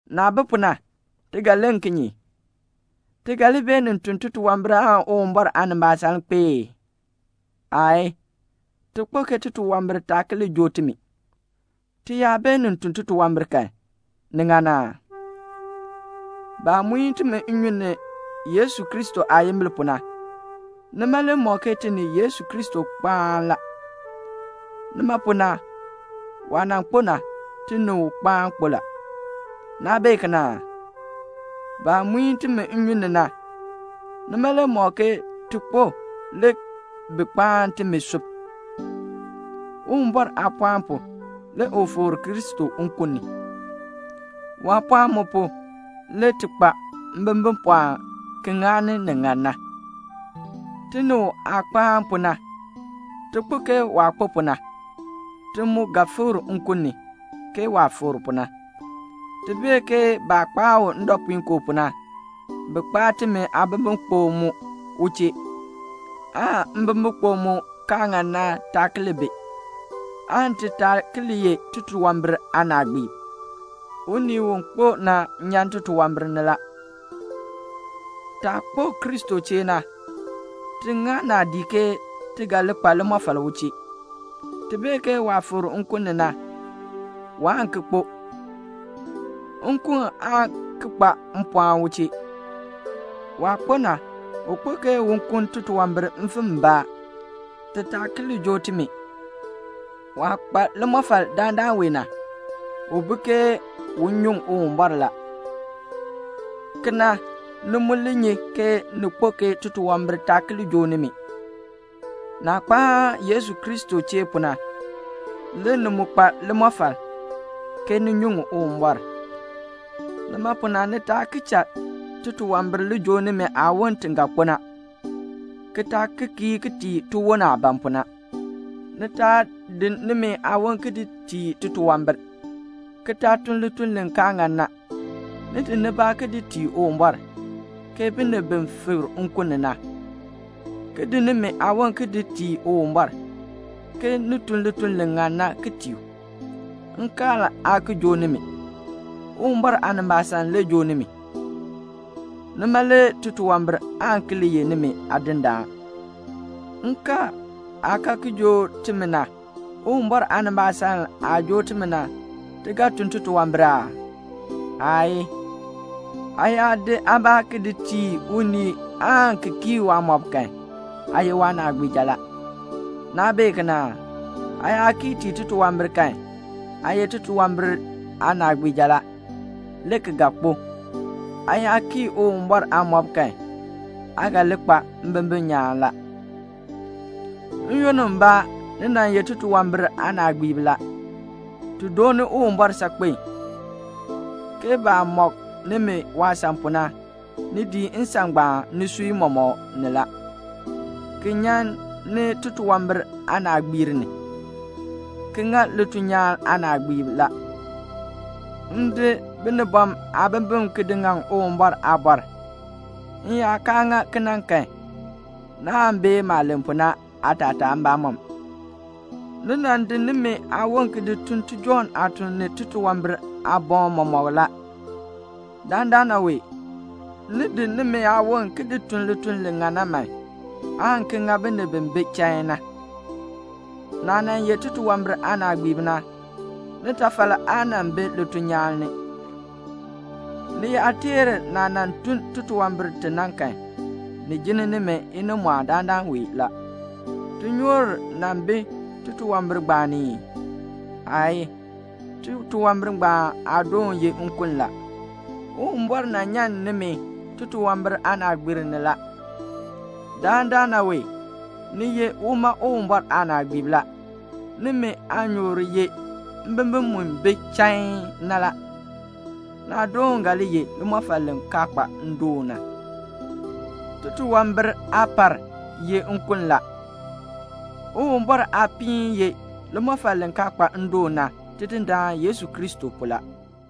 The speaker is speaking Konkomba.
Naah bi pu na, ti ga len kinye? Ti ga li beenin tun titunwambir aan Uwumbɔr aanimbaasaln kpee ee? Aayii. Ti kpo ke titunwambir taa ki li joo timi. Ti yaa beenin tun titunwambir kan, ni ŋan aa? Baah muin timi nnyun ni Yesu Kristo aayimbil pu na, nima le mɔk ke ti ni Yesu Kristo kpaan la. Nima pu na, waah nan kpo na, ti mu kpo u chee la. Naa bee kena aa? Baah muin timi nnyun ni na, nima le mɔk ke ti kpo ki sub u chee. Uwumbɔr aapɔɔn pu, le u fikr Kristo nkun ni. Waapɔɔn mu pu le ti kpa mbimbipɔɔn ki ŋani ni ŋan na. Ti ni u aah kpaan pu na, ti kpo ke waah kpo pu na. Ti mu ga fikr nkun ni, ke waah fikr pu na. Ti bee ke baah kpaa u ndɔpuinkoo pu na, bi kpaa timi aabimbikpok mu u chee, aan mbimbikpok mu kaa ŋan na taa ki li bi, aan ti taa ki li ye titunwambir aanaagbiib. Unii u kpo na nyan titunwambir ni la. Taah kpo Kristo chee na, ti ŋa naadii ke ti ga li kpa limɔfal u chee. Ti bee ke waah fikr nkun ni na, waan ki kpo. Nkun aa ki kpa mpɔɔn u chee. Waah kpo na, u kpo ke un kuln titunwambir mfim mbaa, ti taa ki li joo timi. Waah kpa limɔfal dandana wee na, u bi ke un nyuŋ Uwumbɔr la. Kena, ni mu li nyi ke ni kpo ke titunwambir taa ki li joo nimi. Naah kpaan Yesu Kristo chee pu na, le ni mu kpa limɔfal, ke ni nyuŋ Uwumbɔr. Nima pu na ni taa ki cha titunwambir li joo nimi aawon ti ga kpo na, ki taa ki kii tii tiwon aah ban pu na. Ni taa di nimi aawon ki di tii titunwambir, ki taa tun lituln li kaa ŋan na. Ni di nibaa ki di tii Uwumbɔr, ke binib bi fikr nkun ni na, ki di nimi aawon ki di tii Uwumbɔr, ke ni tun lituln li ŋan na ki tii u. Nkaal aa ki joo nimi. Uwumbɔr aanimbaasaln le joo nimi. Nima le titunwambir aan ki li ye nimi aadindaan. Nkaal aah kaa ki joo timi na, Uwumbɔr aanimbaasaln aah joo timi na, ti ga tun titunwambir aa? Aayii. Aa yaa di aabaa ki di tii unii aan ki kii waamɔb kan, aa ye waanaagbiija la. Naa bee kena aa? Aa yaa kii tii titunwambir kan, aa ye titunwambir aanaagbiija la, le ki ga kpo. Aa yaa kii Uwumbɔr aamɔb kan, aa ga li kpa mbimbin nyaan la. N-yoonn mbaa, ni nan ye titunwambir aanaagbiib la. Ti dooni Uwumbɔr saakpen, ke baah mɔk nimi waasan pu na, ni dii nsan ngbaan nisui mɔmɔk ni la, ki nyan ni titunwambir aanaagbiir ni, ki ŋa lituln nyaan aanaagbiib la. M di binibɔm aabimbin ki di ŋaŋ Uwumbɔr aabɔr; m yaa kaa ŋa kena kan, naan bee maah len pu na aatataa mbamɔm. Ni nan di nimi aawon ki ti tun tijɔŋ aatuln ni titunwambir aaboŋ mɔmɔk la. Dandana wee, ni di nimi aawon man, ki ti tun lituln li ŋan na, aan ki ŋa binib bi bi chain na. Naah nan ye titunwambir aanaagbiib na, nitafal aa nan bi lituln nyaan ni. Ni yaa teer naah tun titunwambir ti na kan, ni jinn nimi inimɔɔn dandana wee la. Tinyoor nan bi titunwambir ngbaan ni ii? Aayii. Titunwambir ngbaan aadoon ye nkun la. Uwumbɔr nyan nimi titunwambir aanaagbiir ni la. Dandana wee ni ye uma Uwumbɔr aanaagbiib la. Nimi aanyoor ye mbimbin mu bi chain na la. Naadoon ga li ye limɔfal li kaa kpa ndoon na. Titunwambir aapar ye nkun la. Uwumbɔr aapiin ye limɔfal li kaa kpa ndoon na, Tidindaan Yesu Kristo pu la.